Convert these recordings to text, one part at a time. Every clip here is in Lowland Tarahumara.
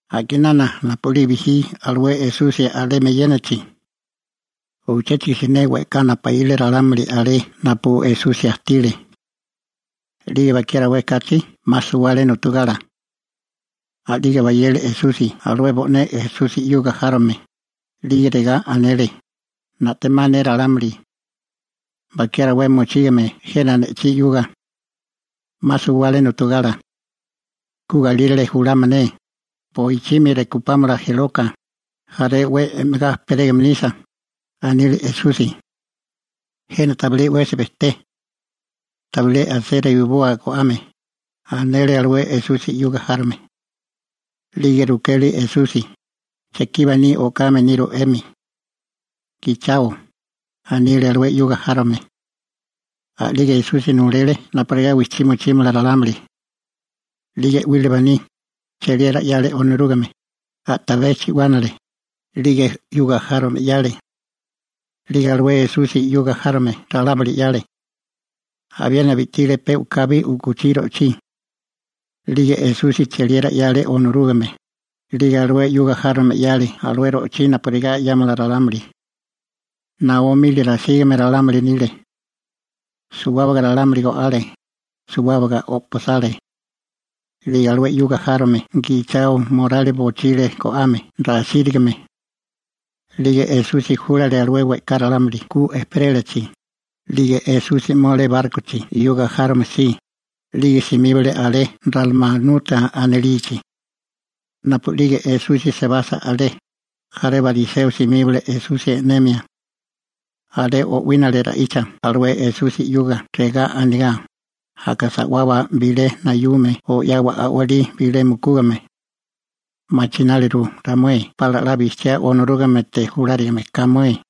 A'kinana napu'lige alué Esusi bijí alemi eyénachi, uchéchigo siné we'ká napaíle ralámuli alé napu Esusi ajtile. 'Lige bakiá rawé kachi 'ma suwale nu'tugala. A'lige bayele Esusi alué bo'né Esusi 'yuga járome, 'lige regá anele: ―Na'temá ne ralámuli. Bakiá rawé mochígame jena ne'chí 'yuga. 'Ma suwale nu'tugala. Ku galírale julámala ne, boichimi rekupámala jeloka, jaré 'we e'megá ejperégame nisa ―anile Esusi. ―Jena tabilé 'wesi bejté. Tabilé asé reiboa go'ame ―anele alué Esusi 'yuga járome. 'Lige rukele Esusi: ―¿Chekí baní o'kame niru 'emi? ―Gichao ―anile alué 'yuga járome. A'lige Esusi nulele napurigá wijchí mochímala ralámuli. 'Lige 'wile baní, cheliera 'yale Onorúgame, a'tabé chi'wánale, 'lige 'yuga járome 'yale. 'Lige alué Esusi 'yuga járome ralámuli 'yale. Abiena bi'tile pe u'kabi u'kuchí ro'chí. 'Lige Esusi cheliera 'yale Onorúgame, 'lige alué 'yuga járome 'yale alué ro'chí napurigá 'yámala ralámuli. Naó mili rasígame ralámuli nile. Suwábaga ralámuli go'ale, suwábaga o'pasale. 'Lige alué 'yuga járome gichao morali bochile go'ame rasírigame. 'Lige Esusi júlale alué we'ká ralámuli ku ejperélachi, 'lige Esusi 'mole bárkochi 'yuga járome si, 'lige simíbale alé Ralmanuta anilichi. Napu a'lige Esusi sebasa alé, jaré bariseo simíbale Esusi e'nemia. Alé o'wínale ra'icha alué Esusi 'yuga regá anigá: ―Aka sa'wawa bilé nayume o 'yawa a'walí bilé mukúgame. Machináliru ramué pala 'la bijchiá Onorúgamete julárigame ka mué.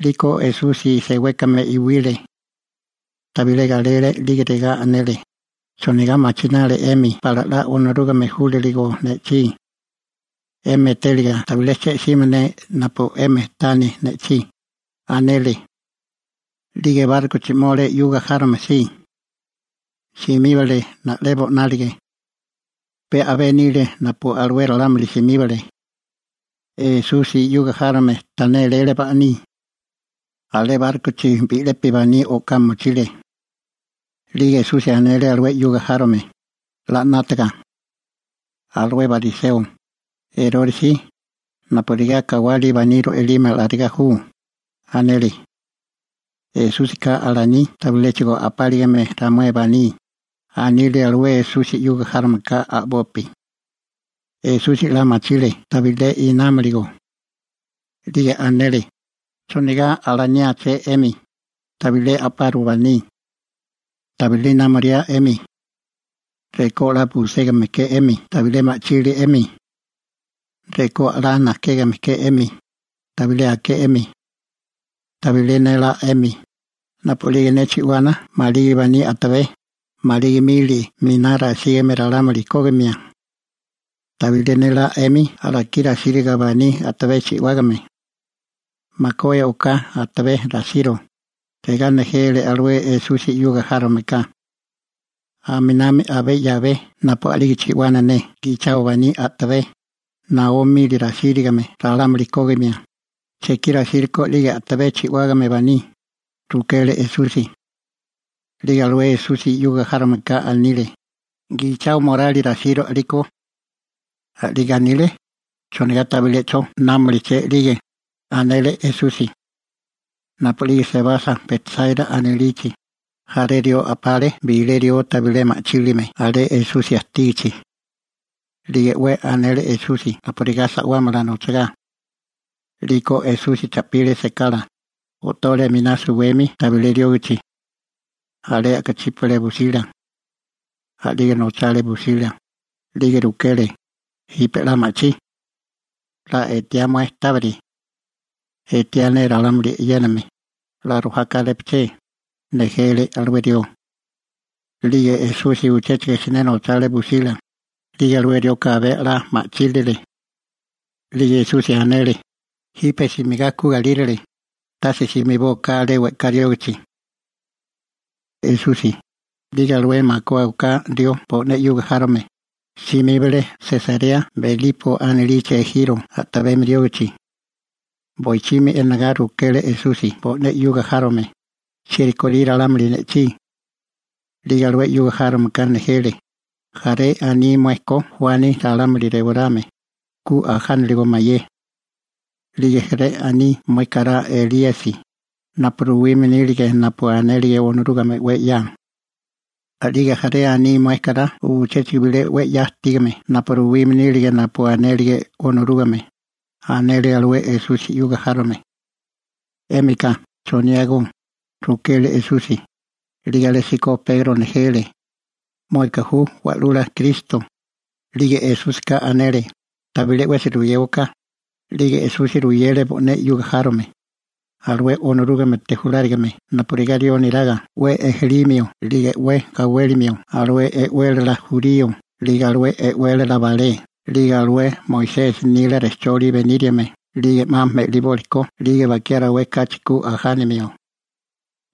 'Liko Esusi sewékame iwile. Tabilé galele 'lige regá anele: ―¿Chonigá machinali 'emi pala 'la Onorúgame júlaligo ne'chí? 'Emi etériga tabilé che'simia ne napu 'emi tani ne'chí ―anele. 'Lige bárkochi 'mole 'yuga járome si. Simíbale na'lebo 'nálige. (Pe a'bé nile napu alué ralámuli simíbale.) Esusi 'yuga járome ta néléle baní. Alé bárkochi bi'lepi baní o'ká mochile. 'Lige Esusi anele alué 'yuga járome: ―'La 'nátaga. Alué bariseo, Erore si, napurigá kawali baní ro'ilime alarigá ju ―anele. ―Esúsika alaní tabiléchigo a'páligame ramué baní ―anile alué Esusi 'yuga járomeka a'bopi. Esusi 'la machile tabilé inámiligó. 'Lige anele: ―¿Chonigá alaniáché 'emi: «Tabilé a'paru baní»? ¿Tabilé inámolia 'emi? Rekó 'la buségame ke 'emi tabilé ma'chili 'emi. Rekó 'la najkégame ke 'emi, tabilé aké 'emi. ¿Tabilé nélá 'emi, napu a'lige ne chi'wana maligi baní a'tabé, maligi mili miná rasígame ralámuli kógimia? ¿Tabilé nélá 'emi alakí rasírigo baní a'tabé chi'wágame? ―Makué oká atabé rasiro ―regá nejele alué Esusi 'yuga járomeka. ―Aminami abé 'yabé napu a'lige chi'wana ne gichao baní a'tabé, naó mili rasígame ralámuli kógimia, ¿chekí rasírikó a'lige a'tabé chi'wágame baní? ―rukele Esusi. 'Lige alué Esusi 'yuga járomeka anile: ―Gichao morali rasiro a'liko. A'lige anile: ¿Chonigá tabilé 'cho námuliché 'lige? ―anele Esusi. Napu'lige sebasa Betsáira anilichi, jaré rió a'pale bilé rió tabilé ma'chílime alé Esusi ajtígichi. 'Lige 'we anele Esusi napurigá sa'wámala nochagá. 'Liko Esusi cha'pile sekala, o'tole a'miná suwemi tabilé riógichi. Alé a'kachípale busila. A'lige nochale busila, 'lige rukele: ―¿Jipe 'la ma'chí? ¿'La etiá mué tábiri? ―Etiá ne ralámuli e'yéname, 'la rojá kárépaché ―nejele alué rió. 'Lige Esusi uchéchigo siné nochale busila, 'lige alué rioka abé 'la ma'chílile. 'Lige Esusi anele: ―Jipe simigá ku galírale, tase simibóaká alé we'ká riógichi. Esusi, 'lige alué makué oká rió bo'né 'yuga járome, simíbale Sesarea Belipo anilichi ejiro a'tabemi riógichi. Boichimi enagá rukele Esusi bo'né 'yuga járome: ―¿Chieri korí ralámuli ne'chí? 'Lige alué 'yuga járomeka nejele: ―Jaré aní mué ko Juani ralámuli rewarame, ku ajánaligo mayé. 'Lige jaré aní mué kará Elíasi, napu ruwime nile napu anélige Onorúgame 'we 'ya. 'Lige jaré aní mué kará uchéchigo bilé 'we 'ya ajtígame napu ruwime nílige napu anélige Onorúgame ―anele alué Esusi 'yuga járome. ―¿'Émika, choniágó? ―rukele Esusi. 'Lige alésíko Pegro nejele: ―Mueka ju Wa'lula Kristo. 'Lige Esúsika anele: ―Tabilé 'wesi ruyéwaká. A'lige Esusi ruyele bo'né 'yuga járome, alué Onorúgamete julárigame napurigá rió neraga 'we ejelímio 'lige 'we gawélimio alué e'wélala jurío 'lige alué e'wélala balé 'lige alué Moisesi nila rejcholi beníriame 'lige 'ma me'libólikó 'lige bakiá rawé kachi ku ajánimio.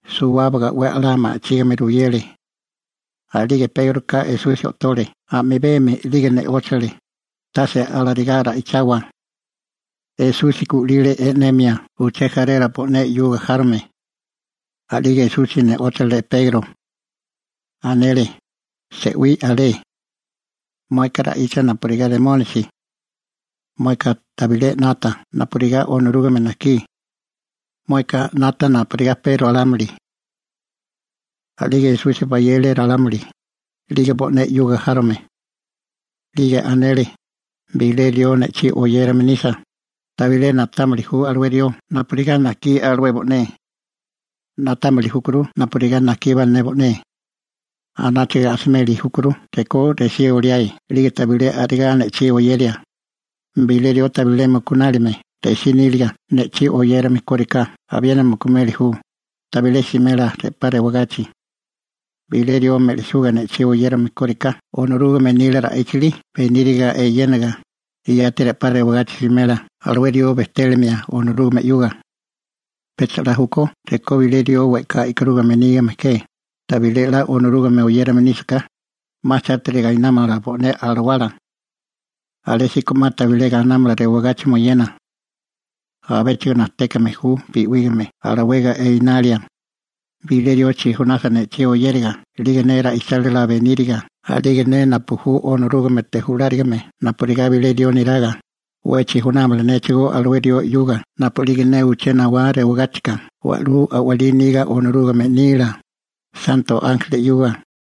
Suwábaga 'we a'lá ma'chígame ruyele. A'lige Pégroka Esusi o'tole a'mibemi 'lige ne'óchale: ―Tase alarigá ra'ichawa. Esusi gu'lile e'nemia uché jarela bo'né 'yuga járome. A'lige Esusi ne'óchale Pegro. Anele: ―Se'wí alé. Mueka ra'icha napurigá Remónisi. Mueka tabilé 'nata napurigá Onorúgame najkí. Mueka 'nata napurigá pe ralámuli. A'lige Esusi bayele ralámuli, 'lige bo'né 'yuga járome. 'Lige anele: ―Bilé rió ne'chí oyérame nisa, tabilé na'támili ju alué rió napurigá najkí alué bo'né. Na'támili júkuru napurigá najkíbá ne bo'né. Anáchaga asimeli júkuru rekó resí oliae 'lige tabilé a'rigá ne'chí oyeria. Bilé rió tabilé mukunálime resí níliga ne'chí oyérame kóriká abiena mukumeli ju, tabilé simela re'pá rewagachi. Bilé rió me'lisuga ne'chí oyérame kóriká Onorúgame nila ra'íchili beníriga eyénaga, yati re'pá rewagachi simela alué rió bejtélimia Onorúgame 'yuga. Pecha 'la júkó rekó bilé rió we'ká e'karúgame nígame ke, tabilé 'la Onorúgame oyérame nísaká, 'ma chátiri gainámala bo'né alawala. Alésíko 'ma tabilé gainámala rewagachi moyena. Abéchigo najtékame ju bi'wígame alawega enalia. Bilé rió chijunasa ne'chí oyériga 'lige ne ra'ichálila beníriga a'lige ne napu ju Onorúgamete julárigame napurigá bilé rió neraga, 'we chijunámala néchigó alué rió 'yuga napu'lige ne uché nawá rewagáchika wa'lú a'walí niga Onorúgame nila, santo ánjeli 'yuga.